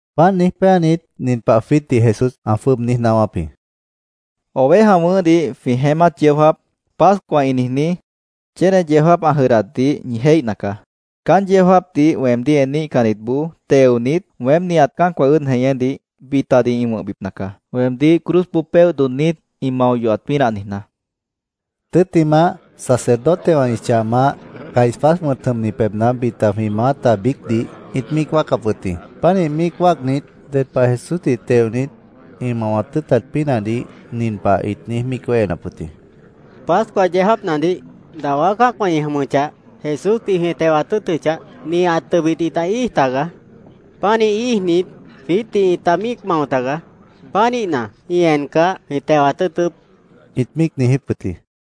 Páant niíj péanit, nin pah Jesús jwiítdih ã jwʉ́ʉb niíj naáwáp jĩ: —Oveja wʉ̃ʉ́hdih jwĩ jeémát yeó jáap, Pascua ĩ niijní, chéne yeó jáap ã jʉdhdatdih ñi jéihna caá. Caán yeó jáapdih weemdíh eníhcannitboó teonit, weém nihat cã́acwã ʉ́ʉd jeñédih bitadih ĩ wʉ̃hbipna caá, weemdíh cruzboó péoh dodhnit ĩ mao yohat pínah niijná, ã niijíp jĩ. Tʉ́ttimah, sacerdotewã ĩ chah maáh, Caifás wʉ̃t jʉmni pebhna bita jwĩ maáta biícdih ĩt míic wáacap wʉt jĩ. Pánih míic wáacnit, ded pah Jesúsdih teonit, ĩ mawat tʉ́ʉtat pínahdih nin pah ĩt niíj míic wéhenap wʉt jĩ: —Pascua yeó jáapnadih, dawá cã́acwã ĩ jʉmʉchah, Jesúsdih jwĩ tewat tʉ́ʉtʉchah, nihat tʉbit ĩta íij tagaá. Pánih íijnit, jwiítdih ĩta míic mao tagaá. Pánihna, ĩ encah, jwĩ tewat tʉ́ʉtʉ́p, ĩt míic niijíp wʉt jĩ.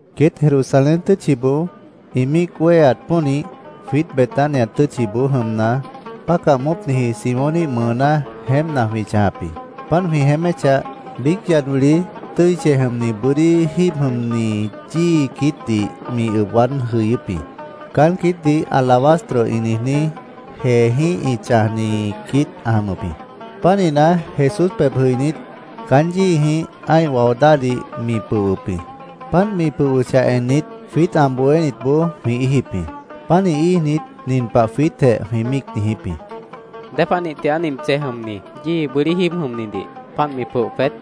Queét Jerusalén tʉ́tchiboó ĩ míic wéheat pónih, jwiít Betania tʉ́tchiboó jʉmna, bácah moópniji Simóníh mʉʉná jeémpna jwĩ chãjap jĩ. Páant jwĩ jeéméchah, biíc yad wili tʉ́i chej jʉmni bʉ́dí jíib jʉmni yíi quiítdih mi ʉb waád jʉyʉ́p jĩ. Caán quiít alabastro ĩ niijní jeejĩ́h ĩ chãjni quiít ã jʉmʉp jĩ. Pánihna, Jesús pebh jʉinít, caán yíijĩh ã́ih wao dáhdih mi pʉhwʉp jĩ. Páant mi pʉhwʉchah ennit, jwiít ã bohénitboó jwĩ íijip jĩ. Pánih íijnit, nin pah jwiítjeh jwĩ míic niijíp jĩ: —¿Dépanih tigaá nint chej jʉmni yíi bʉ́dí jíib jʉmnidih páant mi pʉoh peét?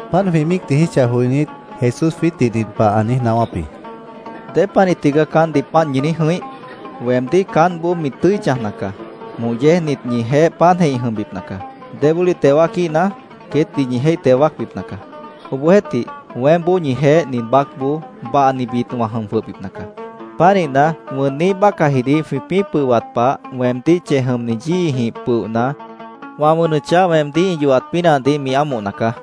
Páant jwĩ míic niijíchah joinít, Jesús jwiítdih nin pah ã niíj naáwáp jĩ: —¿Dépanih tigaá caántdih páant ñi niíj jʉ̃ih? Weemdíh caántboó mi tʉ́i chãjna caá. Moh yéejnit ñijeéh páantjeh ĩ jʉmbipna caá. Débólih teo wáaquíhna, queétdih ñi jéih teo wáacbipna caá. Obohjeéhtih, weémboó ñijeéh nin baácboó bahnibit wã jʉm jwʉhbipna caá. Pánihna, wʉnniíh bácahjidih jwĩpĩ́ pʉhwat pah, weemdíh chej jʉmni yíijĩh pʉohna, wã wʉnʉchah weemdíh ĩ yohat pínahdih mi ámohna caá.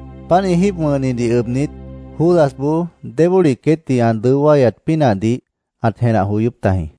Páant ĩ jíib wʉ̃hnidih ʉbnit, Judasboó débólih queétdih ã dʉó wáyat pínahdih ãt jenah joyóp tajĩ.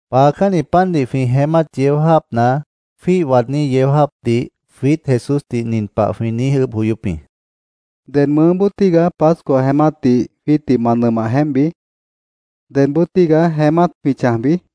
Paacánni pandih jwĩ jeémát yeó jáapna jwíih waadní yeó jáapdih jwiít Jesúsdih nin pah jwĩ niíj ʉʉ́bh joyóp jĩ: —¿Ded mʉʉ́boo tígaá Pascua jeémátdih jwiítdih ma nʉmah jeémpbi? ¿Dedboo tígaá jeémát jwĩ chãjbi? jwĩ niijíp jĩ.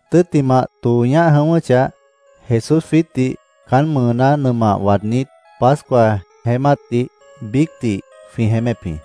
Tʉ́ttimah, tõo ñáh jʉ̃ʉ́wʉ́chah, Jesús jwiítdih caán mʉʉná nʉmah waadnít, Pascua jeémátdih biícdih jwĩ jeémép jĩ.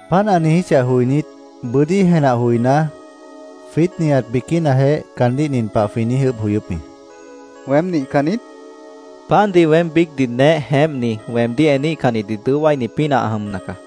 Páant ã niijíchah joinít, bʉ́dí jenah joiná, jwiít nihat biquínajeh caandíh nin pah jwĩ niíj ʉʉ́bh joyóp jĩ: —¿Weém nihcan niít? jwĩ niijíp jĩ. —Pandih weém biícdih neéh jeémpni weemdíh eníhcannitdih dʉó wáini pínah ã jʉmna caá.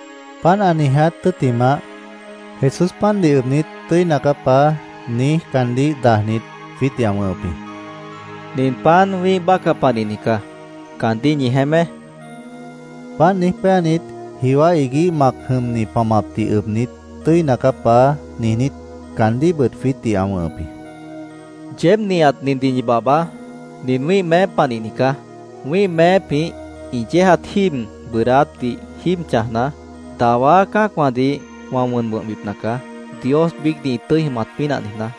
Páant ã niiját tʉ́ttimah, Jesús pandih ʉbnit, “Tʉ́ina caá, Paá”, niíj, caandíh dajnit, jwiítdih ã wʉ̃hʉp jĩ. —Nin pan wĩ́ih bácah panihni caá. Caandíh ñi jeémé, ã niijíp jĩ. Páant niíj péanit, jiwá iguíh mac jʉmni pamapdih ʉbnit, “Tʉ́ina caá, Paá”, niijnít, caandíhbʉt jwiítdih ã wʉ̃hʉp jĩ. —Yeéb nihat nindih ñi babhbaá. Nin wĩ́ih meép panihni caá. Wĩ́ih meépjĩh ĩ yéejat jíib bʉʉdáátdih jíib chãjna, dawá cã́acwãdih wã wʉn wʉ̃hbipna caá, Dios biícdih ĩ tʉ́i jʉmat pínah niijná.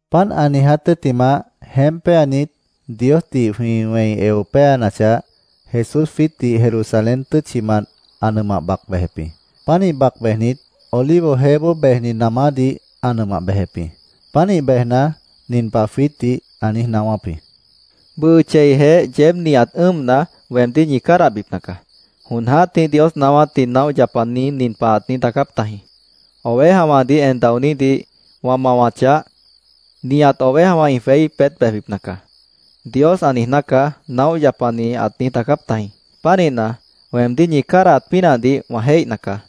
Páant ã niiját tʉ́ttimah, jeémp péanit, Diosdih jwĩ wẽi eo péanachah, Jesús jwiítdih Jerusalén tʉ́tchimant ã nʉmah bac bejep jĩ. Pánih bac bejnit, Olivo jeéboó bejni namádih ã nʉmah bejep jĩ. Pánih bejna, nin pah jwiítdih ã niíj naáwáp jĩ: —Bʉʉ cheijeh yeéb nihat ʉ́ʉmna, weemdíh ñi cádahbipna caá. Jon jã́tih Dios naáwátdih naóh yapani nin pah ãt niíj daacáp tajĩ: ‘ “Ovejawãdih en daonídih wã mawachah, nihat ovejawã ĩ jweí peét bejbipna caá”, Dios ã niijná caá’, naóh yapani ãt niíj daacáp tajĩ.Pánihna, weemdíh ñi cádahat pínahdih wã jéihna caá.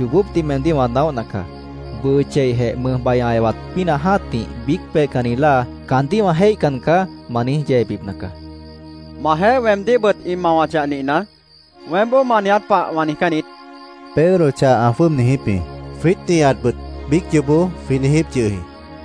—Yoobópdih meemdíh wã naóhna caá. Bʉʉ cheijeh mʉjbai ã ewat pínah jã́tih biíc peihcanni láa ‘¡Caandíh wã jéihcan caá!’ ma niíj yeebipna caá, Jesús caandíh ã niijíp jĩ. —Majeéh weemdíhbʉt ĩ mawachah nihna, weémboó ma niiját pah wã niijcán niít, Pedro chah ã jwʉ́ʉb niijíp jĩ. Jwiít nihatbʉt biíc yoobó jwĩ niijíp yʉh jĩ.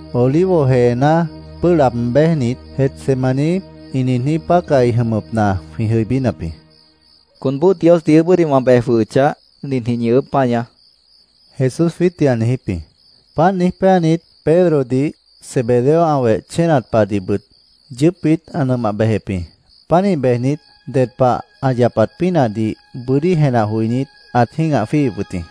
Olivo jeená pʉ́ʉh laab béjnit, Getsemaní ĩ niijní pácahi jʉmʉpna jwĩ jʉibínap jĩ. —Conboó Diosdih ʉʉ́bʉ́dih wã bej jwʉhʉchah, ninjĩh ñi chʉ́ʉd páñaá, Jesús jwiítdih ã niijíp jĩ Páant niíj péanit, Pedrodih, Zebedeo ã weh chénat pahdihbʉt yʉʉ́pbit ã nʉmah bejep jĩ. Pánih bejnit, ded pah ã yapat pínahdih bʉ́dí jenah joinít, ãt jĩ́gah jwíihip wʉt jĩ.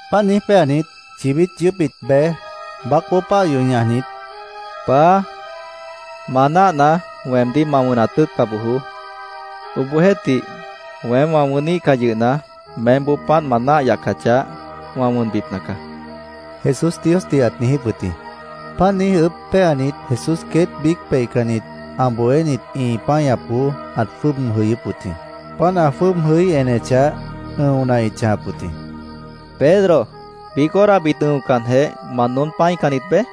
Páant niíj péanit, chibít yʉʉ́pbit bej, baácboó páah yoh ñajnit, “Paá, ma náahna, weemdíh ma wʉnat tʉ́ʉtca bojoó. Obohjeéhtih, weém wã wʉníhcah yʉhna, meémboó páant ma náah yacachah, wã wʉn wʉ̃hbipna caá”, Jesús Diosdih ãt niijíp wʉt jĩ. Páant niíj ʉʉ́bh péanit, Jesús queét biíc peihcannit ã bohénit ĩ páñapboó ãt jwʉ́ʉb jʉyʉ́p wʉt jĩ. Páant ã jwʉ́ʉb jʉí enechah, ʉ̃ona ĩt chãjap wʉt jĩ. —¿Pedro, biíc horabit ʉ̃ocanjeh, ma noón pã́icannit beé?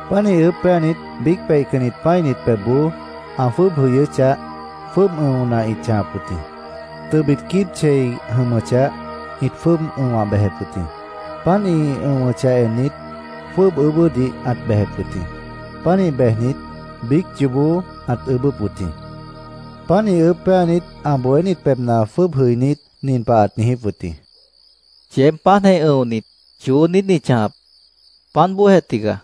Pánih ʉʉ́bh péanit, biíc peihcannit pã́init pebhboó ã jwʉ́ʉb jʉyʉ́chah, jwʉ́ʉb ʉ̃ona ĩt chãjap wʉt jĩ. Tʉbit quíib chei jʉmʉchah, ĩt jwʉ́ʉb ʉ̃wah bejep wʉt jĩ. Páant ĩ ʉ̃wʉchah ennit, jwʉ́ʉb ʉʉ́bʉ́dih ãt bejep wʉt jĩ. Pánih bejnit, biíc yoobó ãt ʉʉ́bʉ́p wʉt jĩ. Pánih ʉʉ́bh péanit, ã bohénit pebhna jwʉ́ʉb jʉinít, nin pah ãt niijíp wʉt jĩ: —¿Yeéb páantjeh ʉ̃onit, choó niít ñi chãjap? Páant bóojeh tigaá.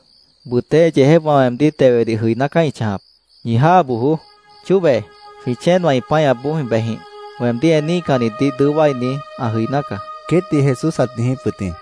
Bʉtéh yeejépwã weemdíh tewedih jʉiná caá ĩ chãjap. Ñi jáa bojoó. Chóbe, jwĩ chéenwã ĩ páñapboó jwĩ bejjĩh. Weemdíh eníhcannitdih dʉó wáini ã jʉiná caá, queétdih Jesús ãt niijíp wʉt jĩ.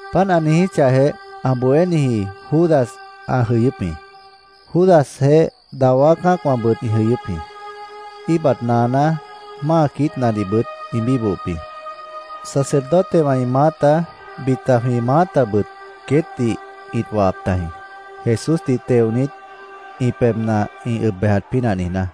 Páant ã niijíchahjeh, ã bohéniji Judas ã jʉyʉ́p jĩ. Judasjeéh dawá cã́acwãbʉt ĩ jʉyʉ́p jĩ. Íibat naaná, máa quiítnadihbʉt ĩ bíbohop jĩ. Sacerdotewã ĩ maáta, bita jwĩ maátabʉt queétdih ĩt wahap tajĩ, Jesúsdih teonit, ĩ pebhna ĩ ʉb bejat pínah niijná.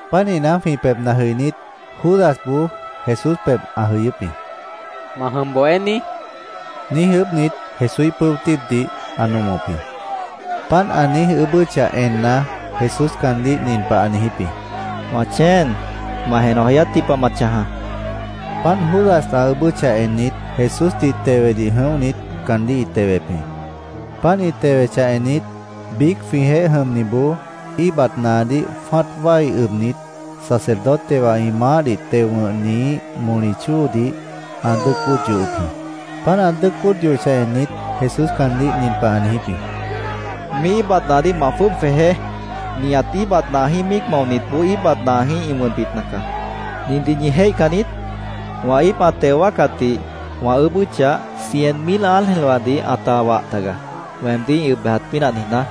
Pánihna, jwĩ pebhna jʉinít, Judasboó Jesús pebh ã jʉyʉ́p jĩ. —¿Ma jʉm, Bohéní? niíj ʉʉ́bhnit, Jesúíh pʉ́o tíibdih ã nomop jĩ. Páant ã niíj ʉʉ́bʉ́chah enna, Jesús caandíh nin pah ã niijíp jĩ: —Wã chéen, ma jenah joyátji pah ma chãjaá, ã niijíp jĩ. Páant Judas ã ʉʉ́bʉ́chah ennit, Jesúsdih tewedih jʉ̃óhnit caandíh ĩ tewep jĩ. Páant ĩ tewechah ennit, biíc jwĩjeéh jʉmniboó íibat naadíh jwã́at wái ʉbnit, sacerdotewã ĩ maáhdih teo wʉ̃hniíh moli chóodih ã dʉ́ʉc bóod yohop jĩ. Páant ã dʉ́ʉc bóod yohochah ennit, Jesús caandíh nin pah ã niijíp jĩ: —Míih íibat naadíh ma jwʉ́ʉb jwejeé. Nihat íibat naajĩ́h míic maonitboó íibat naajĩ́h ĩ wʉnbipna caá. ¿Nindih ñi jéihcan niít? Wã íip ã teo wáacatdih wã ʉʉ́bʉ́chah, cien mil ángelwãdih ãta wah taga, weemdíh ĩ ʉb bejat pínah niijná.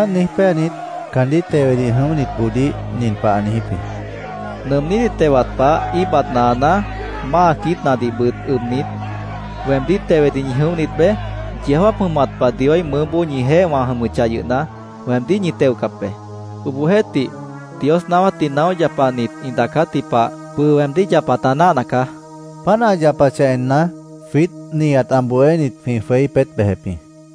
Páant niíj péanit, caandíh tewedih jʉinítboodíh nin pah ã niijíp jĩ: —¿Nʉʉmnídih tewat pah íibat naaná, máa quiítnadihbʉt ʉbnit, weemdíh tewedih ñi jʉ̃óhnit beé? Yeó jáap jʉmat pah Dioíh mʉʉ́boó ñijeéh wã jʉmʉchah yʉhna, weemdíh ñi teocap be. Obohjeéhtih, Dios naáwátdih naóh yapanit ĩ daacátji pah bʉʉ weemdíh yapat ã náahna caá, ã niijíp jĩ. Páant ã yapachah enna, jwiít nihat ã bohénit jwĩ jweí peét bejep jĩ.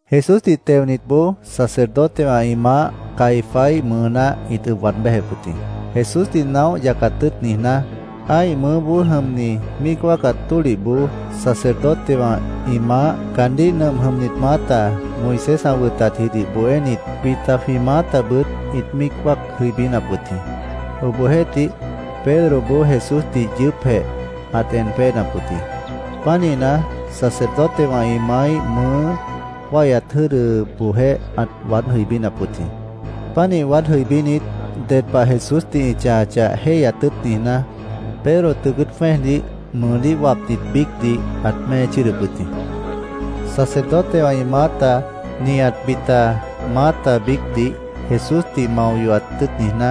Jesúsdih teonitboó sacerdotewã ĩ maáh Caifáíh mʉʉná ĩt ʉb waad béjep wʉt jĩ. Jesúsdih naóh yacat tʉ́ʉt niijná, ã́ih mʉʉ́boó jʉmni míic wáacat tólihboó sacerdotewã ĩ maáh, caandíh nʉmp jʉmnit maáta, Moisés ã wʉtatjidih bohénit, bita jwĩ maátabʉt ĩt míic wáac jʉibínap wʉt jĩ. Obohjeéhtih, Pedroboó Jesúsdih yʉʉ́pjeh ãt en péenap wʉt jĩ. Pánihna, sacerdotewã ĩ maáíh mʉʉ́ wáihyat jʉ́dʉboojéh ãt waád jʉibínap wʉt jĩ. Pánih waád jʉibínit, ded pah Jesúsdih ĩ chãjachah, jéihyat tʉ́ʉt niijná, Pedro tʉʉ cʉ́ʉt jwẽ́ejdih, mʉʉdíh wapnit biícdih, ãt mée chʉ́ʉdʉp wʉt jĩ. Sacerdotewã ĩ maáta, nihat bita maáta biícdih Jesúsdih mao yohat tʉ́ʉt niijná,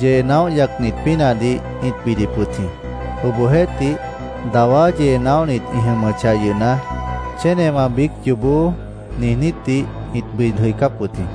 yee naóh yacnit pínahdih ĩt bidip wʉt jĩ. Obohjeéhtih, dawá yee naóhnit ĩ jʉmʉchah yʉhna, chénewã biíc yoobó niijnítdih ĩt bid jʉicáp wʉt jĩ.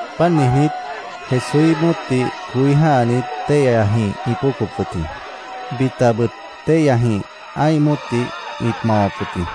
Páant niijnít, Jesúíh móotdih coí jã́hanit, téihyajĩh ĩt póocop wʉt jĩ. Bitabʉt téihyajĩh ã́ih móotdih ĩt mawap wʉt jĩ.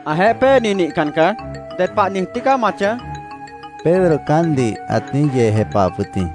—Ãjeéh péeni nihcan caá. ¿Ded pah niij tígaá ma chãj? Pedro caántdih ãt niíj yee jepahap wʉt jĩ.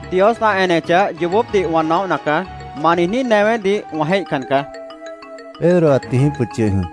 —Dios ã enechah, yoobópdih wã naóhna caá. ¡Ma niijní newédih wã jéihcan caá! Pedro ãt niijíp wʉt yʉh jĩ.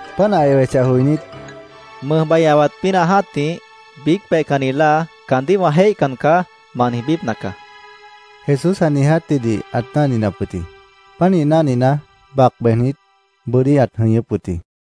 Páant ã ewechah joinít, “Mʉjbai ã ewat pínah jã́tih, biíc peihcanni láa ‘Caandíh wã jéihcan caá’, ma niijbípna caá”, Jesús ã niijátjidih ãt náhninap wʉt jĩ. Pánih náhnina, bac bejnit, bʉ́dí ãt jʉñʉ́p wʉt jĩ.